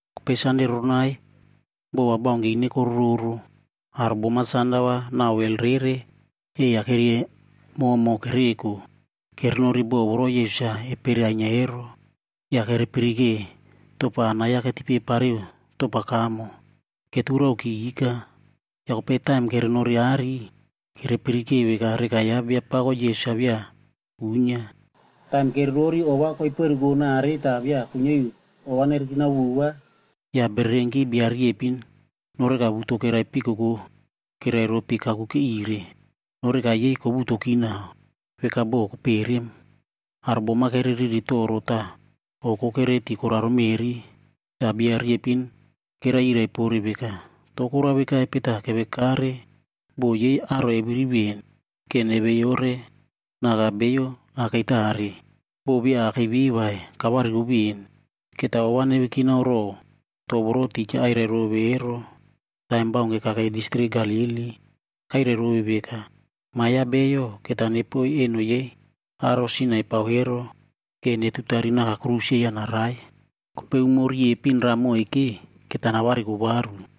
Kopei Sande roronai bo va baunke ine korororo, aro bom-a sanda va nau wel ei-ya keriamomo kereko kerenori bo voro Yesus-a epere ainyia ero. Ya kerepirike topa anai-ya ketipe pariu topa kamo, keturaoki ika. Ya kopei taim kerenori aꞌari, kerepirike veka reka ya Biapako Yesus-a via uinyia. Taim kererori ova koiperuko nare ta via kuinyia iu ova nerekinao vova, ya bererenki bia riepin noreka wuto keraipikoko kerai ropi kakuke ire. Noreka yei kowutoki nau, veka bo koperem. Aro bom-a kereriri toro ta oko kereti koraro meꞌri. Ta bia riepin kerai yirai pore veka, “To korao vekaipe ta kevekare bo yei aro eviri ven, ke neveyore naka bio akei tare? Bo via akei ve vai, kavariko ven. Keta ova nevekinao row to voro tija airai rove ero taim baunke kakei distrik Galili. Kairai rove veka, ‘Ma ya Bio, keta nepoiy eno yei aro sin-a epao ero ke netutari naka aꞌai tiriki ya narai. Kopei umo riepin raꞌa moike, keta navariko varu.’”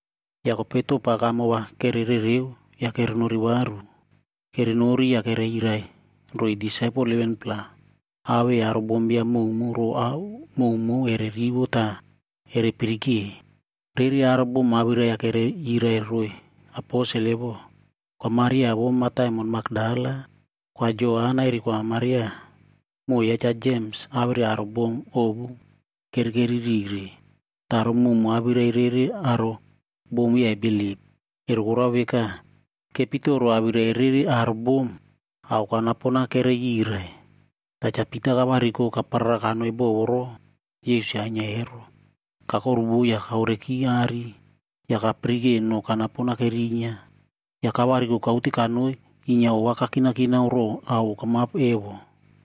Ya kopei topa kamo va kererereo ya kerenori varu. Kerenori ya kereyirai roiy disaipel 11-pla, awei aro bombiam mowmow row ao mowmow ere rivo ta ere pirike. Rere aro bom awirai-ya kereyirai roiy aposel evo, Kwa Maria vou mataimon Makdala, Kwa Joana eri Kwa Maria, moꞌo ya Cha Jems awere aro bom ovu kerekeri rire. Ta aro mowmow awirai rere aro bom via ebilip. Ero korao veka, kepitoro awirai rere aro bom ao kanapon-a kereyirai. Ta Cha Pita kavariko kaparara kanoi bo voro Yesus-a ainyia ero. Kakoruvo ya kaoreki aꞌari, ya kapirike no kanapon-a kerinyia. Ya kavariko kaute kanoi inyia ova kakinakinao row ao okamap evo.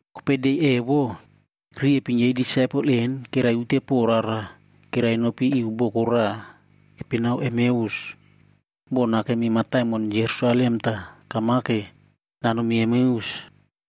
Kopei de evo, riepin yei disaipel en kerai ute po rara kerai nopi iu boko raꞌa keipinao Emeus. Bo nakemi mataimon Jerusalem ta kamake nanomi Emeus,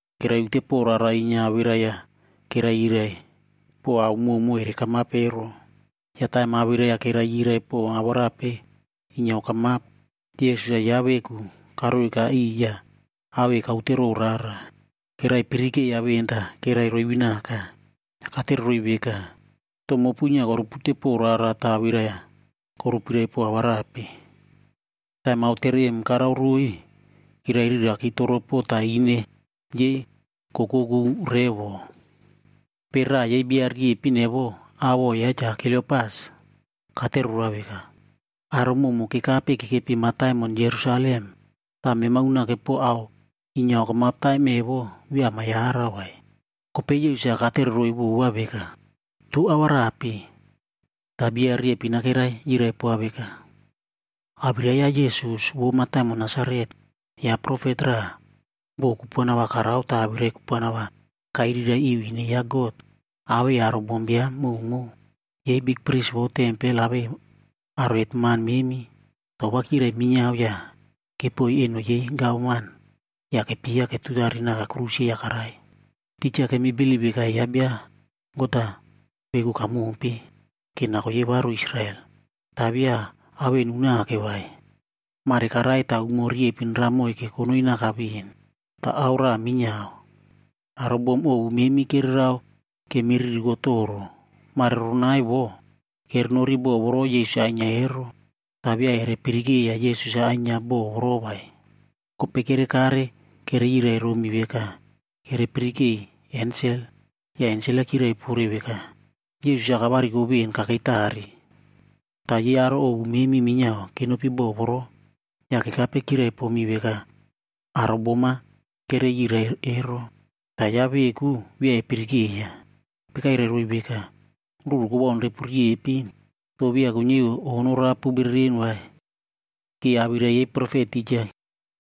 Keraiute po rara inyia awirai-ya kerai yirai pow ao mowmow ere kamap ero. Ya taim awirai-ya kerai yirai pow awarape inyia okamap, Yesus-a yaꞌa veku karoika iꞌiy ya awei kaute row rara. Kerai pirikeiya ven ta kerai roivinaka. Ya katereroiy veka, “To mopu inyia korupute pow rara ta awirai-ya korupirai pow awarape?” Taim aotere em karao roiy, kerairiraki toropo ta ine yei kokoku revo. Kopei raꞌa yei bia riepin evo, awoꞌo yaꞌa Cha Kliopas, katere roa veka, “Aro mowmow kekape kekepi mataimon Jerusalem. Ta mema unake po ao inyia okamap taim evo via ama yarau vai?” Kopei Yesus-a katereroiy vova veka, “To awarape?” Ta bia riepin-a kerai yirai poa veka, “Awirai ya Yesus vou mataimon Nasaret. Yaꞌa profet raꞌa, bo kupuana va karao ta awirai kupuana va kairirai iu ine ya God, awei aro bombiam mowmow. Yei bikpris vou tempel awei aro hetman memi, to va kyirai minyiao ya kepoiy eno yei gavman ya kepyeiya ketutari naka aꞌai tiriki ya karai. Tija kemi bilip veka yaꞌa bia God-a veku kamompe, ke nako yei varu Israel. Ta via ao en unake vai, mare karai ta umo riepin raꞌa moikeb konoi naka ven. Ta ao raꞌa minyiao, aro bom ovu memi kererao kemiririko toro. Mare roronai vo, kerenori bo voro Yesus-a ainyia ero. Ta via ere pirikeiya Yesus-a ainyia bo voro vai. Kopei kerekare kereyirai romi veka kerepirikei ensel, ya ensel-a kyiraipore veka, Yesus-a kavariko ven kakei tare. Ta yei aro ovu memi minyiao kenopi bo voro, ya kekape kyiraipomi veka aro bom-a kereyirai ero. Ta yaꞌa veku, via epirikeiya.” Kopei kairai roiy veka, “Ruru kowaun repu riepin. To via kuinyia iu o norapu bereren vai, ke awirai yei profet tija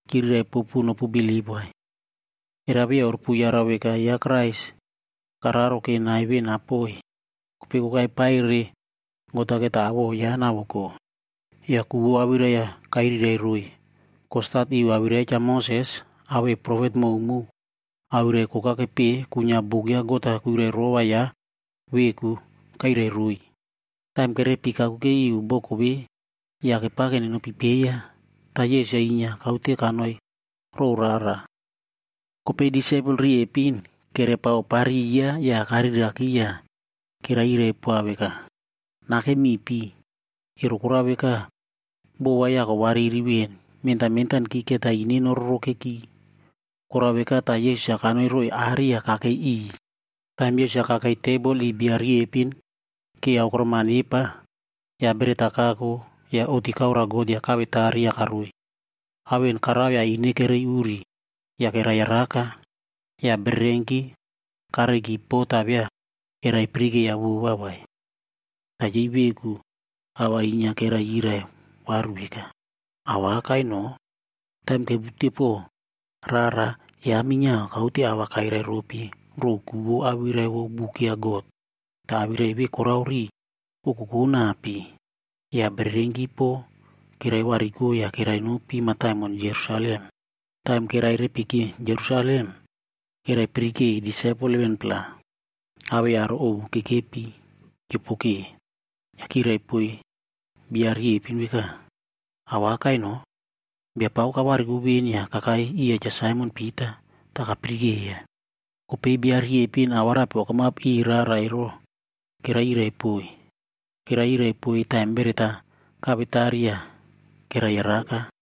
kyiriraipopu nopubilip vai. Era via orupuyarau veka yaꞌa Kraisc kararo ke nai ve napoi, kopei kokai paire God-a keta awoꞌo yaꞌa navoko?” Ya ku vou awirai-ya kairirairoiy. Kostat iu awirai ya Cha Moses awei profet mowmow awirai koka kepeꞌe kuinyia buk ya God-a kuirairova yaꞌa veku, kairai roiy. Taim kerepiki kakuke iu boko ve ya kepake nenopipeiya, ta Yesus-a inyia kaute kanoirow rara. Kopei disaipel riepin kerepaopariya ya kariraki ya keraiyiraipoa veka, “Nakem mipi, ero korao veka, bo va ya kowariri ven mentan mentanki keta ine nororokeki.” Korao veka ta Yesus-a kanoiroiy aꞌari ya kakei iꞌiy. Taim Yesus-a kakei tebol iꞌiy bia riepin ke aokorom-a nepa, ya beret-a kako ya oꞌti kaoroa God ya kawetari ya karoiy. Ao en karao ya ine kerei uri ya keraiyaraka. Ya bererenki kareiki po ta via eraipirikeiya vova vai. Ta yei veku a va inyia keraiyirai varu veka, “Awakai no, taim kepiutepow rara, yaꞌa minyiao kaute a va kairairopi row ku vou awirai vou buk ya God. Ta awirai ve korao riꞌi kokokonapi.” Ya bererenki po keraivariko ya kerainopi mataimon Jerusalem. Taim kerairepiki Jerusalem, keraipirikei disaipel 11-pla awei aro ovu kekepi kyiopoke. Ya kyiraipoiy beiyo riepin veka, “Awakai no! Biapako kavariko ven ya kakai iya Cha Saimon Pita, ta kapirikeiya.” Kopei beiyo riepin awarape okamap iꞌiy rara ero keraiyiraipoiy. Keraiyiraipoiy taim beret-a kawetari ya keraiyaraka.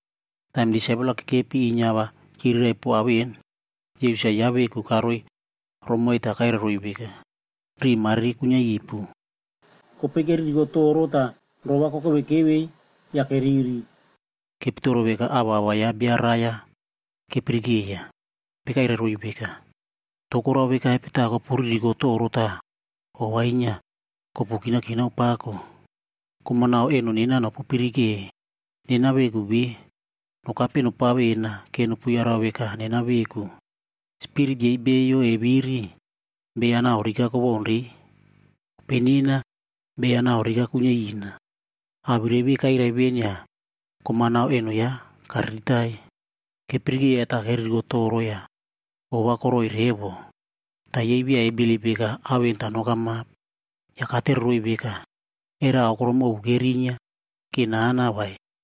Taim disaipel-a kekepi inyia a va kyiriraipow ao en, Yesus-a yaꞌa veku karoiromoiy ta kairai roiy veka, “Riꞌi mariri kuinyiaipu.” Kopei keririkotoro ta roꞌo va kokeveikevei ya keriri. Kepitoro veka avava ya bia raiya kepirikeiya. Kopei kairai roiy veka, “To korao vekaipe ta kopuririkotoro ta ova inyia kopukinakinao pako? Kom-a nau eno nena nopupirike. Nena veku ve, nokape eno nopavena ke nopuyarau veka nena veku. Spirit yei beiyo eviri, beiya nau rika kowaunrei, kopei nena beiya nau rika kuinyiaina.” Awirai ve kairai ven ya kom-a nau eno yaꞌa kariritai. Kepirikeiya ta keririko toro ya ova koroꞌoi revo. Ta yei via ebilip veka ao en ta nokamap. Ya katereroiy veka, “Era aokorom ovu kerinyia ke nana vai?”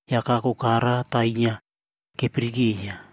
ya kako kara ta inyia kepirikeiya.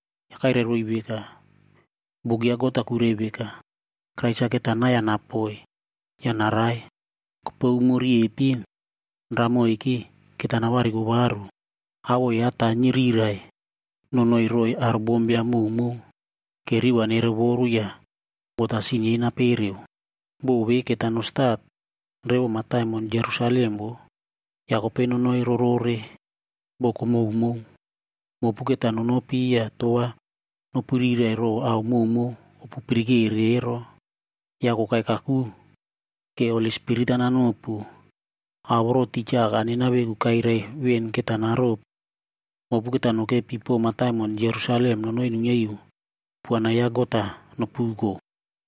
Ya kairai roiy veka, “Buk ya God-a kuirai veka, Krais-a keta nai-ya napoi ya narai. Kopei umo riepin raꞌa moike, keta navariko varu. Awoꞌo yaꞌa ta nyirirai nonoiroiy aro bombiam mowmow, ke riꞌi va nerovoru ya God-a sin yei napereu. Bo ve keta nostat revo mataimon Jerusalem voꞌo, ya kopei nonoirorore boko mowmow. Mopu keta nonopi ya to va nopiriraipow ao mowmow opupirikere ero. Ya kokai kaku, ke Holi Spirita nanopu. Ao voro tija Aka nena veku kairai ven keta naropu. Mopu keta nokepi po mataimon Jerusalem nonoi nuinyiaiu kupuana ya God-a nopuko.”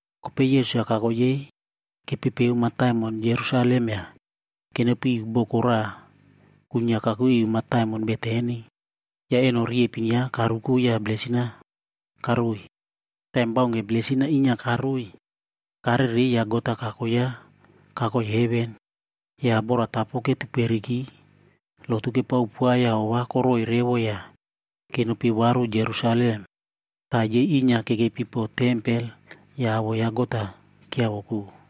Kopei Yesus kako yei kepepeo mataimon Jerusalem ya kenopiiu boko raꞌa kuinyia kakuke iu mataimon Betani, ya eno riepin yaꞌa karuko ya blesin-ad karoiy. Taim baunke blesin-a inyia karoiy, karerei ya God-a kako yaꞌa kakoi heven. Ya boratapo ketuperiki lotu kepaopoa ya ova koroꞌoi revo ya kenopi varu Jerusalem. Ta yei inyia kekepi po tempel ya awoꞌo ya God-a kyiavoko.